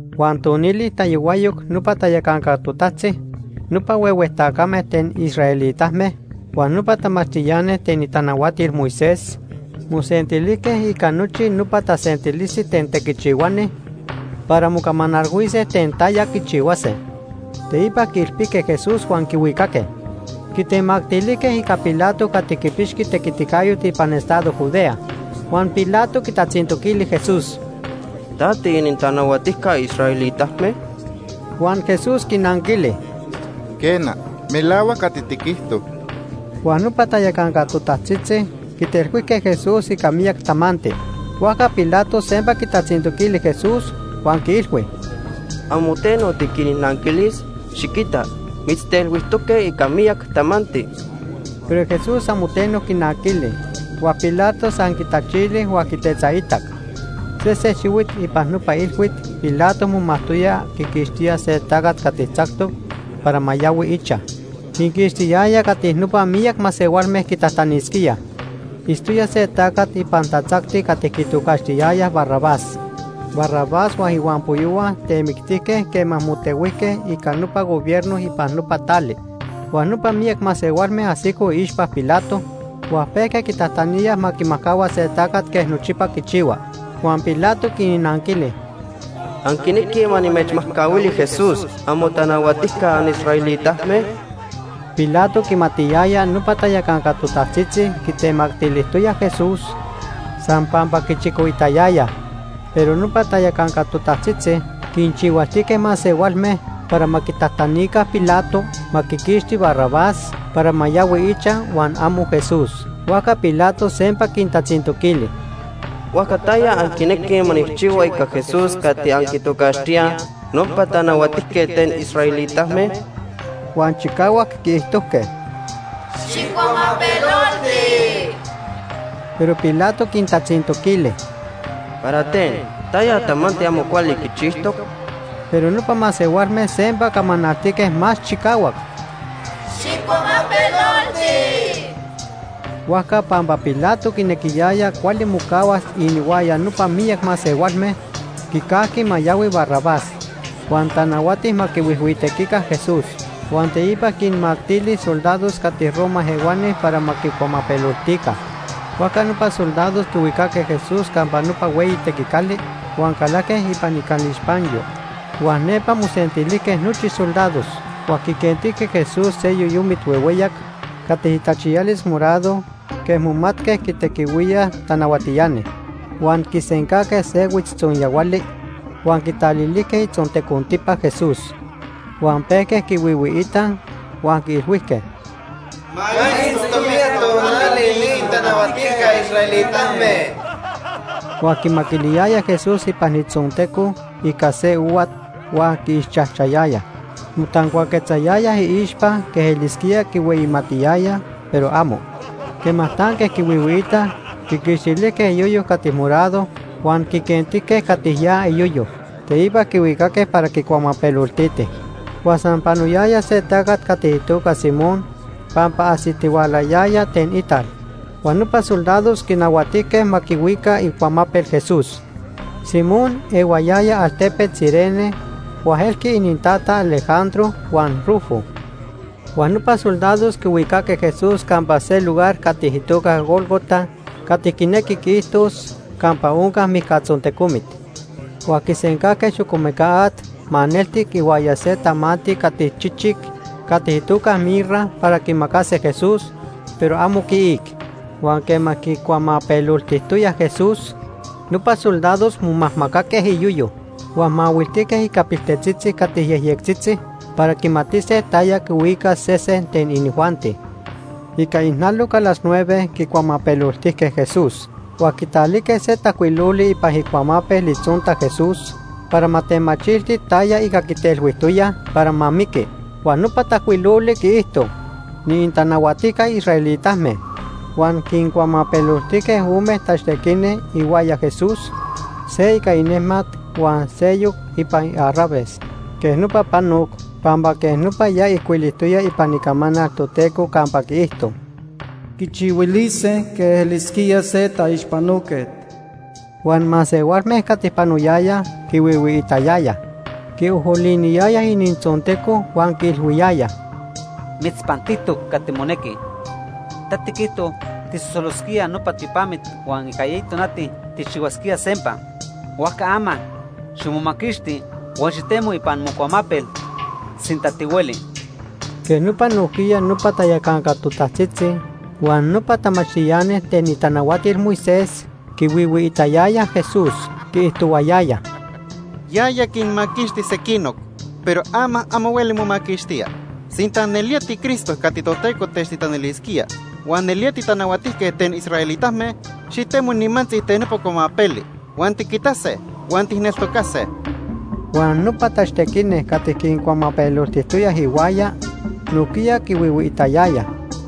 Huan tonili tayohuayoc nopa tayacanca totajtzitzi, nopa huehue tacame ten israelitame, huan nopa tamachtiani ten itanahuatil Moisés, mosentilijque ica nochi nopa tasentilisti ten tequichihuani para mocamanalhuise ten taya quichihuase. Teipa quiilpijque Jesús huan quihuicaque. Quitemactilijque ica Pilato cati quipixqui tequiticayot ipan estado Judea. Huan Pilato quitatzintoquili Jesús: ―¿Ta tiinintanahuatijca israelitame? Huan Jesús quinanquili: ―Quena. Melahuac cati tiquijto. Huan nopa tayacanca totajtzitzi quitelhuijque Jesús ica miyac tamanti. Huajca Pilato sempa quitatzintoquili Jesús, huan quiilhui: ―¿Amo teno tiquinnanquilis? Xiquita, mitztelhuijtoque ica miyac tamanti. Pero Jesús amo teno quinanquili, huan Pilato san quitachili huan quitetzaitac. Sese xihuit ipan nopa ilhuit Pilato momajtoya quiquixtía se tacat cati tzactoc para ma yahui ichaj. Quiquixtiyaya cati nopa miyac masehualme quitajtanisquíaj. Itztoya se tacat ipan tatzacti cati quitocaxtiyayaj Barrabás. Barrabás huan ihuampoyohua temictijque quema motehuijque ica nopa gobierno ipan nopa tali. Huan nopa miyac masehualme ajsicoj iixpa Pilato huan pejque quitajtaníaj ma quimajcahua se tacat quej nochipa quichihuaj. Huan Pilato quinnanquili: ―¿Anquinequij ma nimechmajcahuili Jesús, amotanahuatijca anisraelitame? Pilato quimatiyaya nopa tayacanca totajtzitzi quitemactilijtoyaj Jesús san pampa quichicoitayayaj. Pero nopa tayacanca totajtzitzi quinchihualtijque masehualme para ma quitajtanica Pilato ma quiquixti Barrabás para ma yahui huan amo Jesús. Huajca Pilato sempa quintatzintoquili: ―¿Huajca taya anquinequij ma nijchihua ica Jesús cati anquitocaxtíaj nopa tanahuatijquet ten israelitame? Huan chicahuac quiijtojque: ―¡Xijcuamapelolti! Pero Pilato quintatzintoquili: ―¿Para ten? ¿Taya tamanti amo cuali quichijtoc? Pero nopa masehualme sempa camanaltique más chicahuac: ―¡Xijcuamapelolti! Huajca pampa Pilato quinequiyaya cuali mocahuas inihuaya nopa miyac masehualme, quicajqui ma yahui Barrabás. Huan tanahuati ma quihuijhuitequica Jesús, huan teipa quinmactili soldados cati Roma ehuani para ma quicuamapeloltica. Huajca nopa soldados quihuicaque Jesús campa nopa hueyi tequicali huan calajque ipan icalixpanyo. Huan nepa mosentilijque nochi soldados. Huan quiquentijque Jesús se yoyomit huehueyac cati itachiyalis morado quej momatque quitequihuíaj tanahuatiani. Huan quisencajque se huitztzonyahuali huan quitalilijque itzontecontipa Jesús. Huan pejque quihuihuiitaj huan quiilhuijque: ―¡Ma itzto miyac tonali ni inintanahuatijca israelitame! Huan quimaquiliyayaj Jesús ipan itzonteco ica se ohuat, huan quiixchajchayayaj. Motancuaquetzayayaj iixpa quej elisquía quihueyimatiyayaj, pero amo. Quema tanque quihuihuiitaj, quiquixtilijque iyoyo cati morado huan quiquentijque cati ya iyoyo. Teipa quihuicaque para quicuamapeloltitij. Huan san panoyaya se tacat cati itoca Simón pampa ajsitihualayaya ten ital. Huan nopa soldados quinahuatijque ma quihuica icuamapel Jesús. Simón ehuayaya altepet Cirene huan elqui inintata Alejandro huan Rufo. Huan nopa soldados quihuicaque Jesús campa se lugar cati itoca Gólgota (cati quinequi quiijtos: “Campa Onca Mijcatzontecomit”). Huan quisencajque xocomeca at maneltic ihuaya se tamanti cati chichic cati itoca mirra para quimacase Jesús, pero amo quiic. Huan quema quicuamapeloltijtoyaj Jesús, nopa soldados momajmacaque iyoyo. Huan mahuiltijque ica piltetzitzi cati yejyectzitzi para quimatise taya quihuicas sesen ten inijuanti. Ica ijnaloc a las nueve quicuamapeloltijque Jesús. Huan quitalijque se tajcuiloli ipan icuamapel itzonta Jesús para ma temachilti taya ica quitelhuijtoyaj para ma miqui. Huan nopa tajcuiloli quiijto: NI ININTANAHUATIJCA ISRAELITAME. Huan quincuamapeloltijque ome tachtequini ihuaya Jesús, se ica inejmat, huan seyoc ipan iarraves. Quej nopa panoc pampa quej nopa ya ijcuilijtoya ipan Icamanal Toteco campa quiijto: “Quichihuilise quej elisquía se taixpanoquet.” Huan masehualme cati panoyayaj quihuihuiitayayaj. Quiojoliniyayaj inintzonteco huan quiilhuiyayaj: ―¡Mitzpantijtoc cati monequi! Ta tiquijto tijsosolosquía nopa tiopamit huan ica eyi tonati tijchihuasquía sempa. Huajca ama ximomaquixti huan xitemo ipan mocuamapel, sinta tihueli. Quej nopa nojquiya nopa tayacanca totajtzitzi huan nopa tamachtiani ten itanahuatil Moisés quihuihuiitayayaj Jesús. Quiijtohuayayaj: ―Yaya quinmaquixti sequinoc, pero ama amo hueli momaquixtía. Sinta nelía tiCristo cati Toteco techtitanilisquía huan nelía titanahuatijquet ten israelitame xitemo nimantzi ten nopa cuamapeli huan tiquitase huan tijneltocase. Huan nopa tachtequini cati quincuamapeloltijtoyaj ihuaya, nojquiya quihuihuiitayayaj.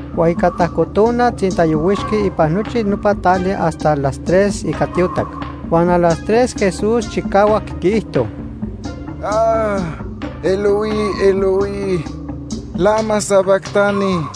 Huan ica tajco tona tzintayohuixqui ipan nochi nopa tali hasta las tres ica tiotac. Huan a las tres Jesús chicahuac quiijto: “Eloi, Eloi, ¿lama sabactani?”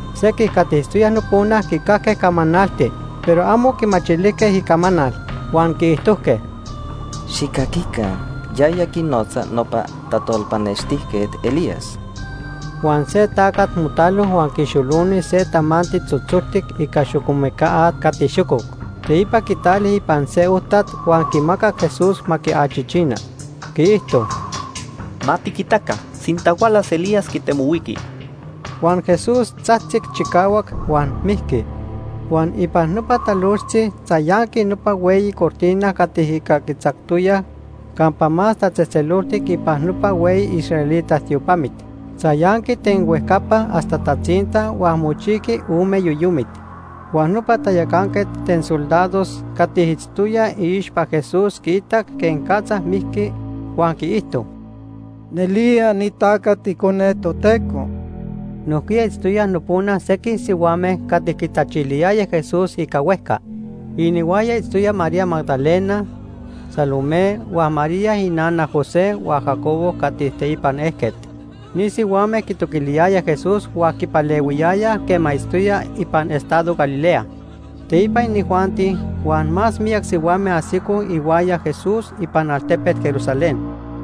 Sequij cati itztoyaj nopona quicajque camanalti, pero amo quimachilijque icamanal, huan quiijtojque: ―¡Xijcaquica! Yaya quinotza nopa tajtolpanextijquet Elías. Huan se tacat motalo huan quixoloni se tamanti tzotzoltic ica xocomeca at cati xococ. Teipa quitali ipan se ojtat huan quimacac Jesús ma quiachichina. Quiijto: ―Ma tiquitaca sinta hualas Elías quitemohuiqui. Huan Jesús tzajtzic chicahuac huan mijqui. Huan ipan nopa talojtzi tzayanqui nopa hueyi cortina cati ica quitzactoyaj Campa Más Tatzejtzeloltic ipan nopa hueyi israelita tiopamit. Tzayanqui ten huejcapa hasta tatzinta huan mochijqui ome yoyomit. Huan nopa tayacanquet ten soldados cati itztoya iixpa Jesús quiitac quenicatza mijqui, huan quiijto: ―Nelía ni tacat Icone Toteco. Nojquiya itztoyaj nopona sequij sihuame cati quitachiliyayaj Jesús ica huejca. Inihuaya itztoyaj María Magdalena, Salomé huan María ininana José huan Jacobo cati teipan ejquet. Ni sihuame quitoquiliyayaj Jesús huan quipalehuiyayaj quema itztoya ipan estado Galilea. Teipa inijuanti huan más miyac sihuame ajsicoj ihuaya Jesús ipan altepet Jerusalén.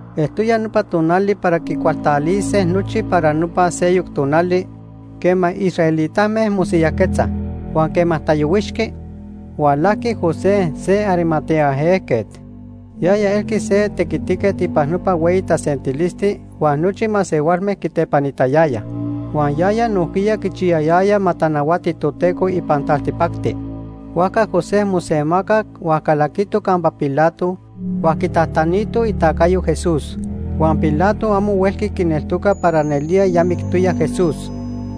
Eltoya nopa tonal para quicualtalise nochi para nopa seyoc tonali quema israelitame mosiyajquetzaj. Huan quema tayohuixqui, hualajqui José se Arimatea ejquet. Yaya elqui se tequitiquet ipan nopa hueyi tasentilisti huan nochi masehualme quitepanitayayaj. Huan yaya nojquiya quichiyayaya ma tanahuati Toteco ipan taltipacti. Huajca José mosemacac huan calaquito campa Pilato huan quitajtanito itacayo Jesús. Huan Pilato amo huelqui quineltoca para nelía ya mictoya Jesús.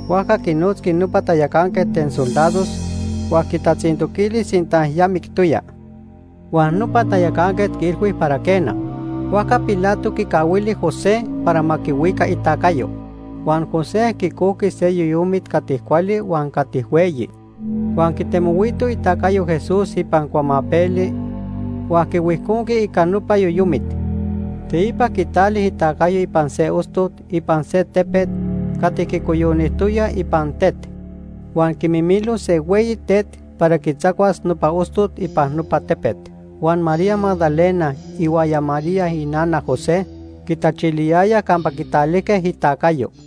Huajca quinotzqui nopa tayacanquet ten soldados huan quitatzintoquili sinta ya mictoya. Huan nopa tayacanquet quiilhui para quena. Huajca Pilato quicahuili José para ma quihuica itacayo. Huan José quicojqui se yoyomit cati cuali huan cati hueyi, huan quitemohuito itacayo Jesús ipan cuamapeli huan quihuijconqui ica nopa yoyomit. Teipa quitali itacayo ipan se ostot ipan se tepet cati quicoyonijtoya ipan tet, huan quimimilo se hueyi tet para quitzacuas nopa ostot ipan nopa tepet. Huan María Magdalena ihuaya María inana José quitachiliyayaj campa quitalijque itacayo.